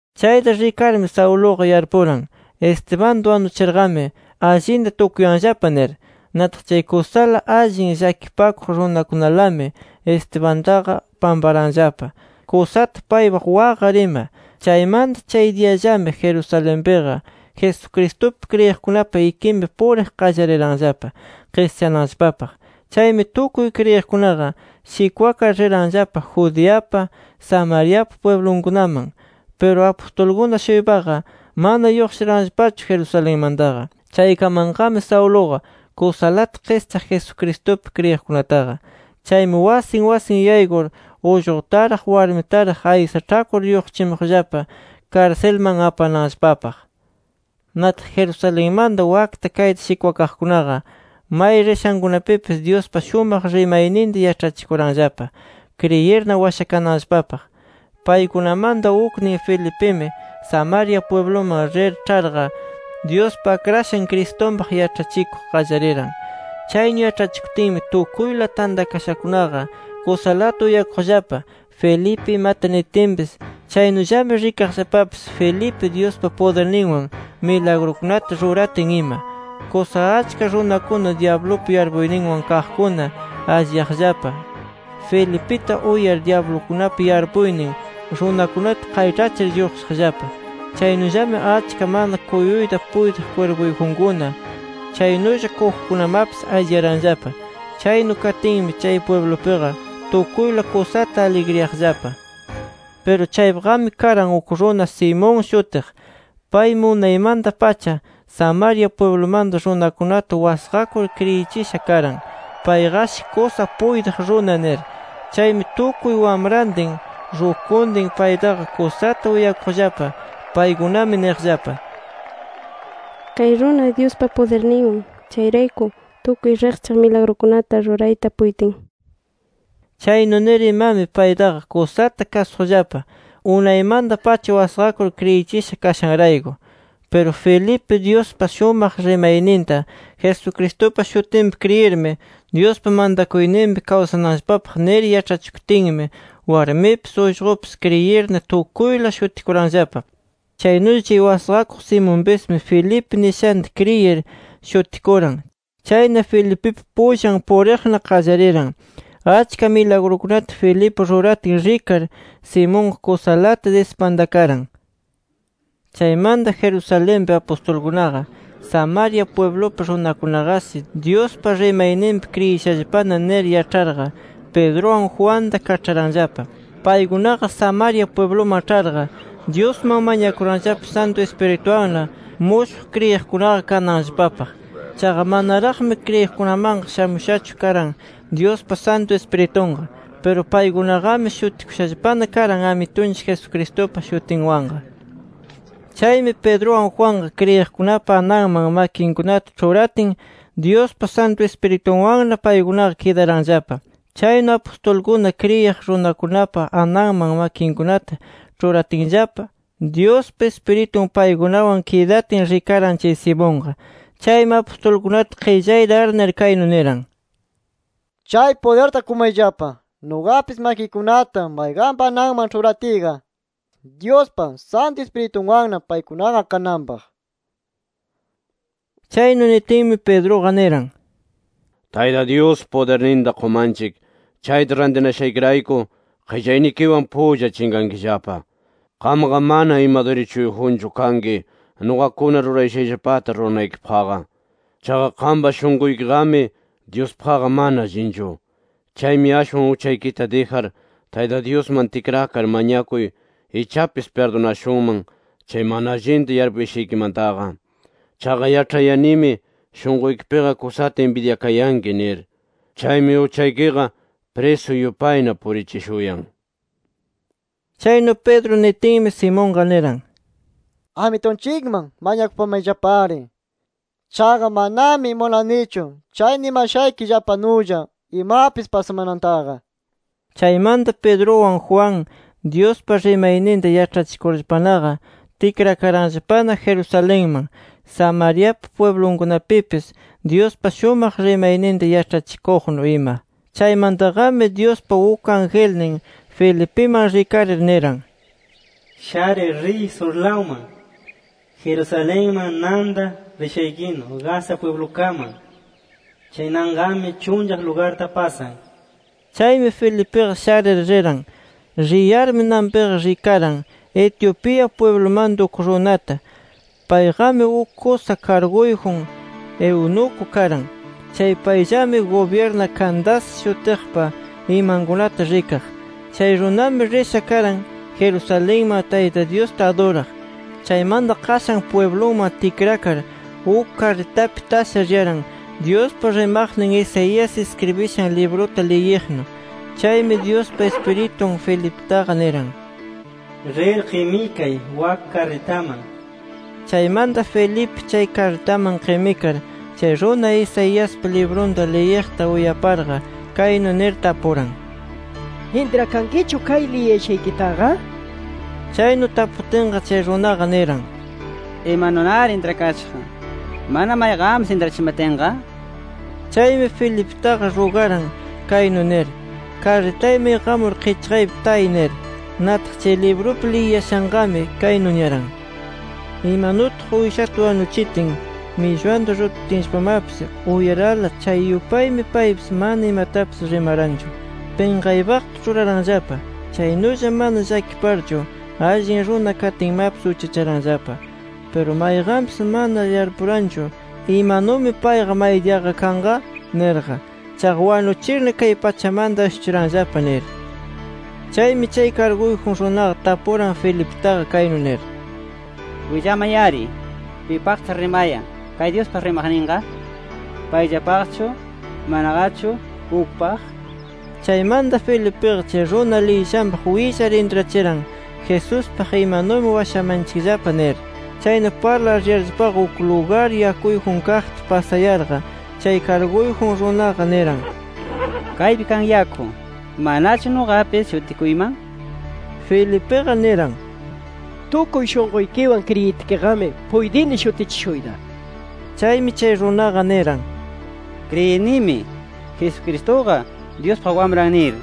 Chayta rikarmi, Sauluqa yarpuran: Estebanta wanuchirqami allinta tukuyanllapa nir. Nataq chay kusala allin llakipakuq runakunalami Estebantaqa pamparanllapa kusata paypaq waqar ima. Chaymanta chay diyallami Jerusalenpiqa, Jesucristupi kriyiqkunapa ikinpi puriq qallariranllapa qischananllapapaq. Chaymi tukuy kriyiqkunaqa shikwakar, riranllapa Judeapa, Samariapa pwiblunkunaman. Piru apustulkuna-shuypaqa mana lluqshiranllapachu Jerusalenmantaqa. Chaykamanqami Sauluqa kusalata qischaq Jesucristupi kriyiqkunataqa. Chaymi wasin wasin yaykur, ullqutaraq warmitaraq aysaĉhakur lluqshichimuqllapa karsilman apananllapapaq. Nataq Jerusalenmanta wakta kayta shikwakaqkunaqa, may rishankunapipis Dyuspa shumaq rimayninta yaĉhachikuranllapa kriyirna washakananllapapaq. Paykunamanta uknin Felipimi, Samaria pwibluman rir ĉharqa, Dyuspa Akrashan Cristunpaq yaĉhachikuq qallariran. Chaynu yaĉhachikutinmi tukuyla tantakashakunaqa kusalata uyakuqllapa, Felipe imata nitinpis. Chaynullami rikaqllapapis Felipe, Dyuspa pudirninwan milagrukunata ruratin ima. Kusa achka runakuna dyablupa yarpuyninwan kaqkuna alliyaqllapa. Felipita uyar, dyablukunapa yarpuynin runakunata qayĉhachir, lluqshiqllapa. Chaynullami achka mana kuyuyta puytiq kwirpuyjunkuna, chaynulla kujukunamapis alliyaranllapa. Chaynu katinmi, chay pwiblupiqa tukuyla kusata aligriyaqllapa. Piru chaypiqami karan uk runa, Simón shutiq. Paymi unaymanta-pacha Samaria pwiblumanta runakunata wasqakur, kriyichisha karan: Payqashi kusa puytiq runa nir. Chaymi tukuy wamrantin, rukuntin paytaqa kusata uyakuqllapa. Paykunami niqllapa: “Kay runa, Dyuspa pudirninwan. Chayrayku tukuy riqchaq milagrukunata rurayta puytin” nir. Chaynu nir imami, paytaqa kusata kasuqllapa unaymanta-pacha wasqakur kriyichisha kashanrayku. Piru Felipe, Dyuspa shumaq rimayninta Jesucristupa shutinpi kriyirmi, Dyuspa mantakuyninpi kawsananllapapaq nir yaĉhachikutinmi, warmipis ullqupis kriyirna tukuyla shutikuranllapa. Chaynulla chay wasqakuq Simonpismi, Felipe nishanta kriyir, shutikuran. Chayna Felipipa pullan puriqna qallariran. Achka milagrukunata Felipe ruratin rikar, Simonqa kusalata dispantakaran. Chaymanta Jerusalenpi apustulkunaqa “Samaria pwiblupi runakunaqashi Dyuspa rimayninpi kriyishallapana” nir yaĉharqa, Pedruwan Juanta kaĉharanllapa. Paykunaqa Samaria pwibluman ĉharqa, Dyusman mañakuranllapa Santu Ispiritunwanna mushuq kriyiqkunaqa kananllapapaq. Chaqa, manaraqmi kriyiqkunamanqa shamushachu karan, Dyuspa Santu Ispiritunqa. Piru paykunaqami shutikushallapana karan Amitunchik Jesucristupa shutinwanqa. Chaymi Pedruwan Juanqa, kriyiqkunapa ananman makinkunata ĉhuratin, Dyuspa Santu Ispiritunwanna paykunaqa kidaranllapa. Chaynu apustulkuna kriyiq runakunapa ananman makinkunata ĉhuratinllapa, Dyuspa Ispiritun paykunawan kidatin rikaran, chay Simonqa. Chaymi apustulkunata qillayta arnir, kaynu niran: —Chay pudirta qumayllapa, nuqapis makiykunata mayqanpa ananman ĉhuratiyqa, Dyuspa Santu Ispiritunwanna paykunaqa kananpaq nir. Chaynu nitinmi, Pedruqa niran: —Tayta Dyus pudirninta qumanchik chayta rantinashaykirayku, qillaynikiwan pulla chinqankillapa. Qamqa mana ima dirichuyjunchu kanki nuqakuna rurashayllapata ruranaykipaqqa. Chaqa qampa shunquykiqami Dyuspaqqa mana allinchu. Chaymi ashwan uchaykita dijar, Tayta Dyusman tikrakar mañakuy ichapis pirdunashunman chay mana allinta yarpushaykimantaqa. Chaqa yaĉhayanimi shunquykipiqa kusata inbidyakayanki nir. Chaymi uchaykiqa prisu yupayna purichishuyan nir. Chaynu Pedro nitinmi, Simonqa niran: —Amitunchikman mañakupamayllapari. Chaqa manami munanichu chay nimashaykillapanulla imapis pasamanantaqa nir. Chaymanta Pedruwan Juan, Dyuspa rimayninta yaĉhachikurllapanaqa, tikrakaranllapana Jerusalenman, Samariapa pwiblunkunapipis Dyuspa shumaq rimayninta yaĉhachikuqnu ima. Chaymantaqami Dyuspa uk angelnin Felipiman rikarir niran: —Sharir riy surlawman, Jerusalenman nanta rishaykinu Gaza pwiblukaman. Chay nanqami chunllaq lugarta pasan. Chaymi Felipiqa sharir, riran. Riyarmi, nanpiqa rikaran Etiopía pwiblumanta uk runata. Payqami uk kusa karguyjun eunuco karan. Chay payllami gubyirna Candace shutiqpa imankunata rikaq. Chay runami risha karan Jerusalenman Tayta Dyusta aduraq. Chaymanta qashan pwiblunman tikrakar, uk karritapi tasha riyaran, Dyuspa rimaqnin Isaías iskribishan libruta liyiqnu. Chaymi Dyuspa Ispiritun Felipitaqa niran: —Rir qimikay wak karritaman nir. Chaymanta Felipe chay karritaman qimikar chay runa, Isaiaspa librunta liyiqta uyaparqa, kaynu nir tapuran: —¿Intrakankichu kay liyiyashaykitaqa? nir. Chaynu taputinqa chay runaqa niran: —¿Imanunari intrakashaq, mana mayqanpis intrachimatinqa? nir. Chaymi Felipitaqa rugaran kaynu nir: —Karritayman iqamur qichqaypi tay nir. Nataq chay librupi liyiyashanqami kaynu niyaran: “Imanutaq Uyshata wanuchitin, millwanta rututinllapamapis uyarala, chay yupaymi paypis mana imatapis rimaranchu. Pinqaypaqta ruraranllapa. Chaynulla mana llakiparchu, allin runa katinmapis uchacharanllapa. Piru mayqanpis mana yarpuranchu ¿imanumi payqa maydiyaqa kanqa? nirqa. Chaqa wanuchirna kay pachamanta ashuchiranllapa” nir. Chaymi chay karguyjun runaqa tapuran Felipitaqa kaynu nir: —Willamay-ari, ¿pipaqtaq rimayan kay Dyuspa rimaqninqa? ¿Payllapaqchu, manaqachu ukpaq? Chaymanta Felipiqa chay runa liyiyashanpaq willar, intrachiran Jesuspaq: “Imanumi washamanchikllapa” nir. Chayna parlar riyarllapaqa, uk lugar yakuyjun kaqta pasayarqa, chay karguyjun runaqa niran: —Kaypi kan yaku. ¿Manachu nuqapis shutikuyman? nir. [ Felipiqa niran: —Tukuy shunquykiwan kriyitkiqami, puytini shutichishuyta. Chaymi chay runaqa niran: —Kriyinimi, Jesucristuqa Dyuspa Wamran nir.]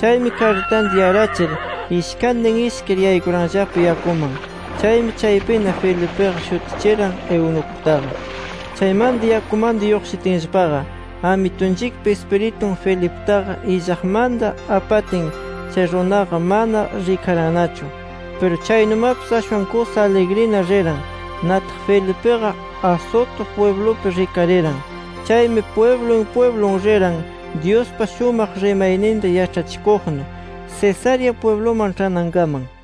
Chaymi karritanta yarachir, ishkantin ishkir, yaykuranllapa yakuman. Chaymi chaypina Felipiqa shutichiran eunucutaqa. Chaymanta yakumanta lluqshitinllapaqa, Amitunchikpa Ispiritun Felipitaqa illaqmanta apatin, chay runaqa mana rikarannachu. Piru chaynumapis ashwan kusa aligrina riran. Nataq Felipiqa Azoto pwiblupi rikariran. Chaymi pwiblun pwiblun riran, Dyuspa shumaq rimayninta yaĉhachikuqnu, Cesarea pwibluman ĉhanankaman.